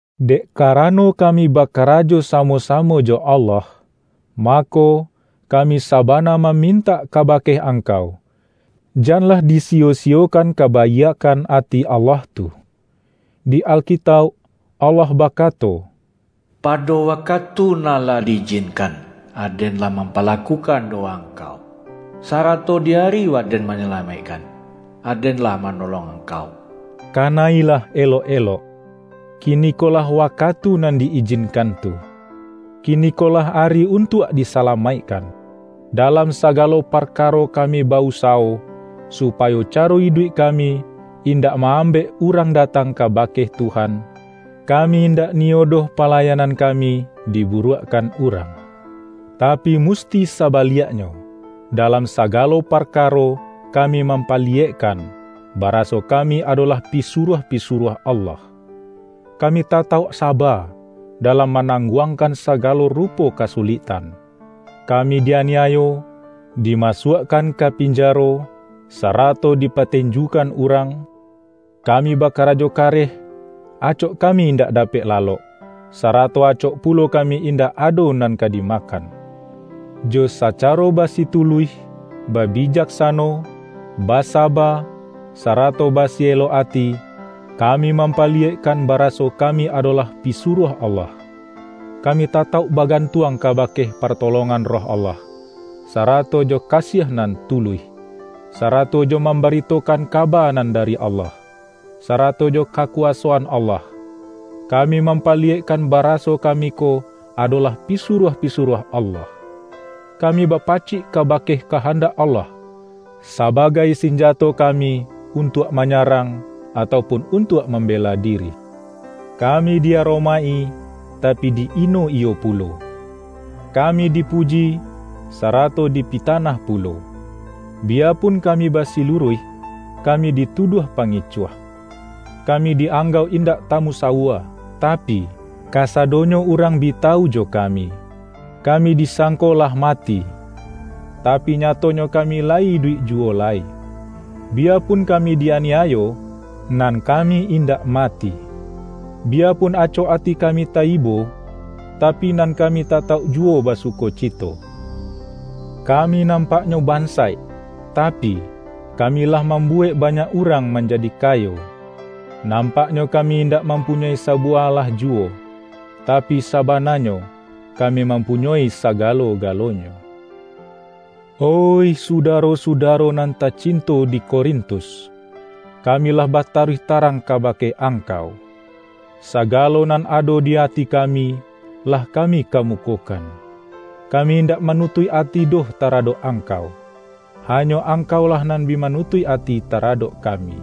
Dek karano kami bakarajo samo-samo jo Allah, mako, kami saba-na mamintak kabake angkau, janlah disiyo-siyokan kabaiakkan ati Allah tu. Di Alkitauk, Allah bakato,”Pado wakatu nan lah di-ijinkan, Aden lah mampalakukan dowa angkau, sarato di ari Waden manyalamaikkan, Aden lah manolong angkau.” Kana-ilah elok-elok, kinikolah wakatu nan di-ijinkan tu. Kinikolah ari untuak disalamaikkan! Dalam sagalo parkaro kami ba-usawo, supayo caro iduik kami, in-dak ma-ambek urang datang kabake Tuhan, kami indak niyo doh palayanan kami diburuakkan urang. Tapi mus-ti sabaliaknyo, dalam sagalo parkaro kami mampaliyekkan, baraso kami adolah pisuruah-pisuruah Allah. Kami tatauk saba, dalam manangguangkan sagalo rupo kasuliktan: kami di-ani-ayo, dimasuakkan ka pinjaro, sarato dipatenjukan urang; kami bakarajo kareh, acok kami indak dapek lalok, sarato acok pulo kami indak ado nan ka dimakan. Jo sacaro basituluih, babijaksano, basaba, sarato basi-elok ati, kami mampaliyekkan baraso ka-mi adolah pisuruah Allah. Kami tatauk bagantuang kabake partolongan Roh Allah, sarato jo kasiah nan tuluih, sarato jo mambaritokan kaba nan da-ri Allah, sarato jo kakuwasoan Allah, kami mampaliyekkan baraso kami ko adolah pisuruah-pisuruah Allah. Kami bapacik kabake kahandak Allah, saba-gai sinjato kami untuak manyarang, atau pun untuak mambela diri. Ka-mi di-aromaik-i, tapi di-ino iyo pulo; kami dipuji, sarato dipitanah pulo. Bi-yapun kami basiluruih, kami dituduah pangicuah. Kami di-anggauk indak tamusawua, tapi, kasadonyo urang bi tawu jo kami. Kami disangko lah ma-ti, tapi nyatonyo kami layi iduik ju-wo lai. Biyapun kami di-aniayo, nan kami indak mati. Biyapun acok ati kami ta-ibo, tapi nan kami tatauk ju-wo basukocito. Kami nampaknyo ban-saik, tapi, kami lah mambuwek banyak urang manjadi kayo. Nampaknyo ka-mi indak mampunyoi sabuwah alah juwo, tapi sabananyo, kami mampu-nyoi sagalo-galonyo. Oih sudaro-sudaro nan tacinto di Korintus! Kami lah bataruih tarang ka-bake angkau. Sagalo nan ado di ati ka-mi, lah kami kamukokan. Kami in-dak manutuik ati doh taradok angkau, hanyo angkaulah nan bi manutuik ati taradok kami.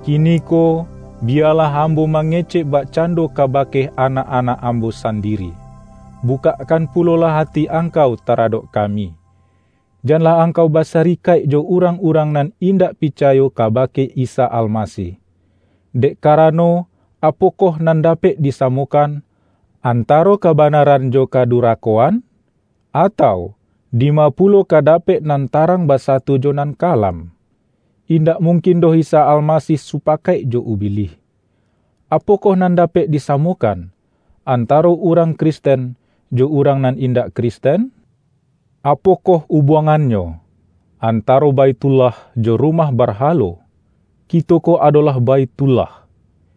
Kiniko, biyalah am-bo mangecek bakcando kabake anak-anak ambo sandiri. Bukakkan pulolah ati angkau taradok kami. Janlah angkau basarikaik jo urang-urang nan indak picayo kabake Isa Almasih. Dek karano, apokoh nan dapek disamokan, antaro kabanaran jo kadu-rakoan? Atau, dima pulo ka dapek nan tarang basatu jo nan kalam. Indak mungkin doh Isa Almasih supakaik jo Ubilih. Apokoh nan dapek disamokan, antaro urang Kristen, jo urang nan in-dak Kristen? Apokoh ubuangannyo, antaro Baithullah jo rumah barha-lo? Kito ko adolah Baithullah,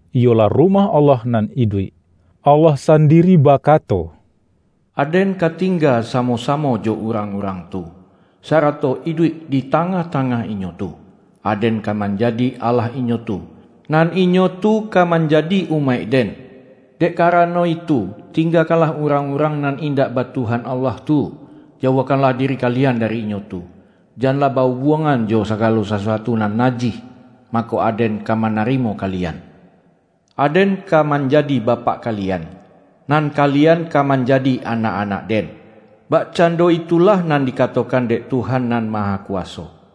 iyolah Rumah Allah nan iduik. Allah sandi-ri bakato,”Aden ka tingga samo-samo jo urang-urang tu, sarato iduik di tangah-tangah inyo tu. Aden ka manjadi Allah inyo tu, nan inyo tu ka manjadi umaik-Den. Dek karano itu, tinggakanlah urang-urang nan indak ba Tuhan Allah tu, jauahkanlah diri kalian dari inyo tu. Janlah ba-ubuangan jo sagalo sasuatu nan najih, mako, Aden ka manarimo kalian. Aden ka manjadi Bapak kalian, nan kalian ka manjadi anak-anak-Den, bakcando itulah nan dikatokan dek Tuhan Nan Mahakuwaso.”